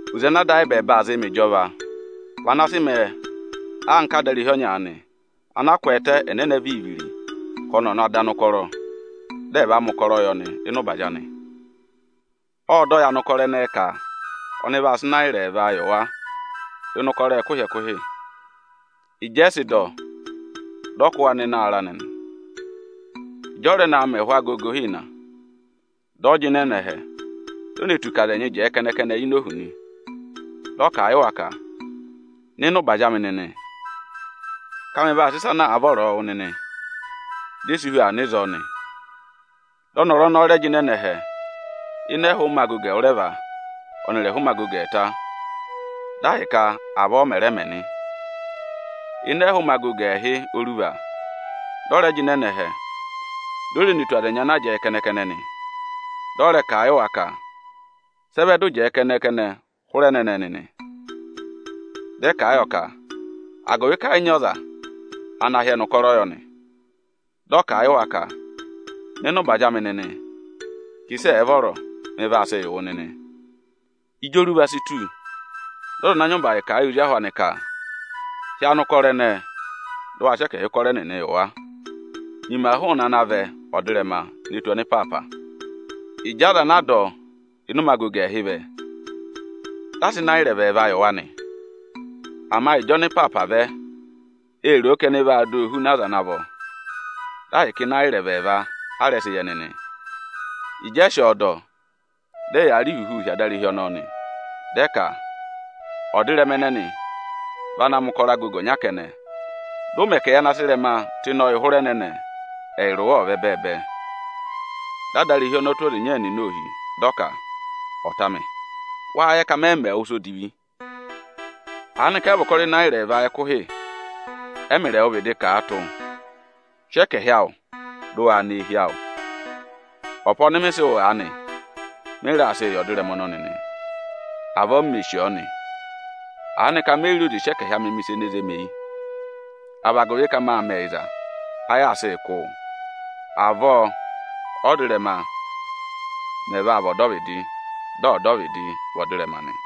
“Oze ana Ada ayị ẹbẹẹba aa zịị mẹ ịjọva vị ana sị mẹẹ anka adarehi ọnya aanị, ana kwẹẹtẹ ẹnẹnẹ viri-viri ka ọnị ọ̀ na dọ anụkọrọ, dị ẹ̀ va mẹ̀ ụkọrọ yị ọnị ịnị ụbazị anị. Ộ dọ yị anụkọrọ ẹnẹẹ ka ọnị vaa sị Ịnayịra ẹẹva yị wa ịnị ụkọrọ ẹkụhị-ẹkụhị. Ịjị ẹ sị dọ, dị ọ kụ́ wa nọ ịnị ụbazị anị nị. Ịjị ọ rẹ naa mẹ ẹhụụ ụmẹ agogo ịhịna, dị ọ jịnẹ nọ ẹhẹ, di o ne tù ka aza ẹnyị jẹẹ kẹnẹ-kẹnẹ ini ohu nị. Dị ọ kà a yị wa ka: ‘Nọ ịnị ụbazị amị nịnị, ka mị vaa sị ịsa ana àa vọrọọ wụ nịnị.’ Di e si hu aa nọ ịzọọ nị. Dị ọnọrụ ọnọọ rẹ jịnẹ nọ ẹhẹ ịnị ẹhụụ ụmẹ agogo ẹwụrẹva ọnịrị ẹhụụ ụmẹ agogo ẹẹta, dị ahịka avọọ ọ mẹ̀ rẹ mẹ nị. Ịnị ẹhụụ ụmẹ agogo ẹẹhị oruva, dị ọ rẹ jịnẹ nọ ẹhẹ, di o re ne tù aza ẹnyị ana jẹẹ kẹnẹ-kẹnẹ nị. Dị ọ rẹ kà a yị wa ka: ‘Sị ẹ vẹ dị ụ jẹẹ kẹnẹ-kẹnẹ hụrẹ ẹnẹnẹ nịnị?’ Dị ẹ kà a yọ ka agụvị ka ẹ yị nyị ọza ana hị́ ẹnị ụkọrọ yọ nị. Dị ọ kà a yị wa ka: ‘Nọ ịnị ụbazị amị nịnị ka ịsị ẹ̀ẹ vọrọ, mị vaa sịị yị wụ nịnị.’ Ịjị oruva si tù, dị ọza ana nyị ụbazị kà a yị ozi ahụ anị ka: ‘Hị́ anụkọrọ ẹnẹẹ, dụ wa sị ẹkẹhị ụkọrọ ẹnịnị yị wa! Nyima hụụnị ana vẹ ọdịrẹma ne tù ọnịpaapa.’ Ịjị aza anaa dọ ịnị ụmẹ agogo ẹẹhị vẹ, dị a sị Ịnayịra ẹvẹẹva yị wa nị. Ama ịjị ọnịpaapa vẹ, ê ro o ka ẹnị vaa dọ ọ hu aza ana vọ. Dị ahịka Ịnayịra ẹvẹẹva a rẹ sị yị ẹnị nị. Ịjị ẹ sị ọọ dọ, dị ẹyaa rị ihuhuu hi adarehi ọnọọ nị, di ẹ ka: ‘Ọdịrẹma ẹnẹnị vị ana mẹ̀ ụkọrọ agogo ọnya kẹnẹ, dị ụ mẹ ka ẹyị ana sị ịrẹma tụ́ ịnị ọyị hụrẹ ẹnẹnẹ, ẹyịrị wa ẹ̀ vị ẹbẹẹbẹ nị.’ Dị adarehi ọnọọ tụ́ ọza ịnya ẹnịnị ohi, dị ọ ka: ‘Ọta amị, wáá yẹ ka mẹ yị mẹ wụ ịsa odivi?’ Aanịka ẹ yị vị ụkọrọ Ịnayịra ẹẹva ẹkụhị ẹ́mịrị ẹwụ vịdị kà a tụ́? Sị ẹkẹhị awụ, dị ụ waa nọ eehi awụ! Ọpa ọnị mị sị wụ aanị, mị raa sịị yị ọdịrẹma ọnọnị nị. Avọọ m mè sì ọọ nị. Aanịka me yi re oze sị ẹkẹhị amị mẹ̀ ịsa ene zé mi eyi? A vị agụvị ka mâ mẹ ẹyịza, áyị aa sịị kụ́ wụụ? Avọọ ọ́dịrẹma mẹ̀ vaa vị ọdọvịdị, dị ọdọvịdị vị ọdịrẹma nị.”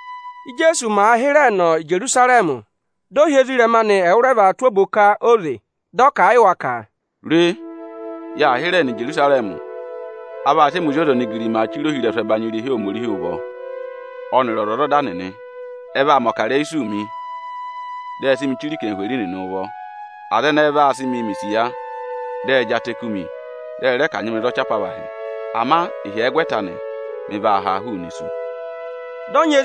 Íjeesu màa hịrẹẹ nọ Ijerusarẹmị, dị ọ hị́ ezirẹma anị ẹwụrẹva tụ́ oboka óze, dị ọ kà a yị wa ka: “Re, yaa hịrẹẹ nọ Ijerusarẹmị. A vaa sị ẹmị Ozi ọza onigirimaa chire ohirẹsụ ẹbanyị irehi Ohomorihi ụvọ, ọnịrị ọzwọzọda nịnị. Ẹ vaa mẹ̀ ọkarẹyị isuu mi; dị ẹ sị mị chire anarịmadọwụ nịnị ụvọ. Aza ẹnẹẹ vaa sị mịị mẹ̀ isiya, dị ẹ jị atẹ kú mi, dị ẹ rẹ kanyị mị za ọchị apavahị. Ama ịhyẹgwẹta anị, mị vaa haa hụụnị isu.” Asị ụ mẹ ọga, waa mẹ ozi ahụ!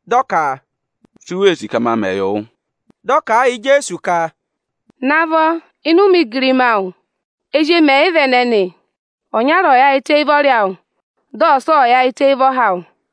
Dị ọ ka, “Si u wee sì ka ma mẹ yị wụ?” Dị ọ kà a yị Ijeesu ka, “Navọ, ịnị ụmẹ igirima awụ, ezi emi ẹyịva ẹnẹnị, ọnyara ọ̀ yaayịtẹ éyi ụvọrị awụ, dị ọsa ọ̀ yaayịtẹ éyi ụvọha awụ!”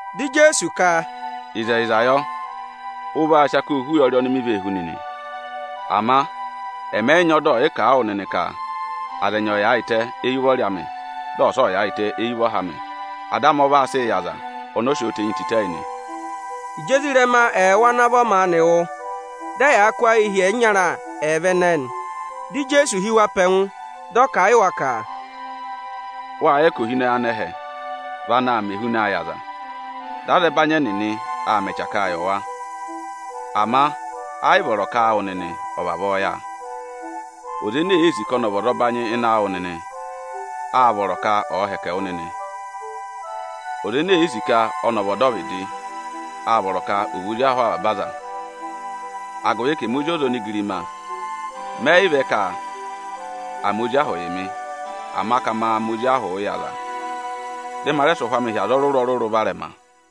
Dị Ijeesu ka, “Ịzẹyịza yọ, ụ vaa sị akoo hú ụyọrị oni mi vee hú nịnị. Ama ẹmị ẹ yị nyị ọda ọyịkà a wụ nịnị ka aza ẹnyị ẹ̀ yaayịtẹ éyi ụvọrị amị, dị ọsa ọ̀ yaayịtẹ éyi ụvọha amị. Ada amị ọ vaa sịị yị aza ọnọọ sị ọọ tenyi tịtẹ yị nị.” Ịjị ezirẹma ẹẹwụ ana vọ maanị wụ́, dị ẹyaa kụ́ ayịị hi ẹyịnyara ẹẹva ẹnẹẹ nị. Dị Ijeesu hị́ wa pe ẹngụ, dị ọ kà a yị wa ka, “Wâ yẹ ka ohinọyị anẹhẹ vị anaā mẹ ehunaa yị aza, dị azẹbanyị ẹnịnị aa mẹ ẹchakaa yị wa. Ama ẹ yị vọrọ ka áawụ nịnị ọ̀ vavọọ yà. Ọza ene èe sì ka ọnị ọ̀ nyị ụbanyị ịnị awụ nịnị, ọ̀ vị ozi ahụ aza ana vọ. Ọza ene èe sì ka ọnị ọ̀ vị ọdọvịdị, â vọrọ ka ọ̀ vị ozi ahụ avaba aza. Agụvị ka ẹmị Ozi ọza onigirima mẹ yị vẹ ka à mẹ ozi ahụ yị mị, ama ka ma mẹ ozi ahụ yị aza, dị ma rẹ sị ụhwẹ amị hị́ aza ọrụrụ-ọrụrụ varẹma.”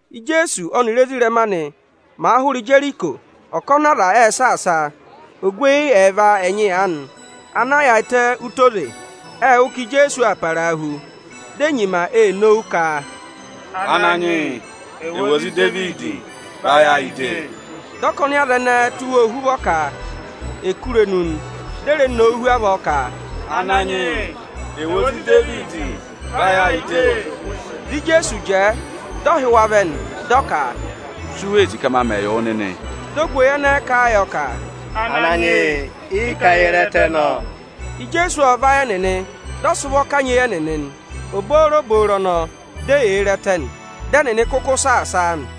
Íjeesu ọnịrị ezirẹma anị màa hụrẹ Ijeriko, ọkọnị aza ệ saasa a. Ogweyi ẹẹva ẹnyị aanị ana yaayịtẹ ụtọ oze, ệ wụ́ ka Ijeesu aa parahu. Di e nyima ee nowu ka, “Ananyị yị, ẹwụ ozi Idevidi, vayị ayị de!” Dị ọkọnị aza ẹnẹẹ tụ́ wa ohuvọ ka è kú irenu ẹnịnị nị. Di e re nowu hu avọọ ka, “Ananyị yị, ẹwụ Ozi Idevidi, vayị ayị de!” Dị Ijeesu jẹẹ, dị ọ hị́ wa vẹ nị, dị ọ ka, “Si u wee sì ka ma mẹ yị wụ nịnị?” Dị ogweyi ẹnẹẹ kà a yọ ka, “Ananyị yị, ị ka ye re ẹtẹ nọ.” Ijeesu ộ vayị ẹnịnị, dị ọ sị ụvọ kanyị eyi ẹnịnị nị. Obooboro ọnọọ, di eyee re ẹtẹ nị. Dị ẹnịnị kụkụ saasa a nị.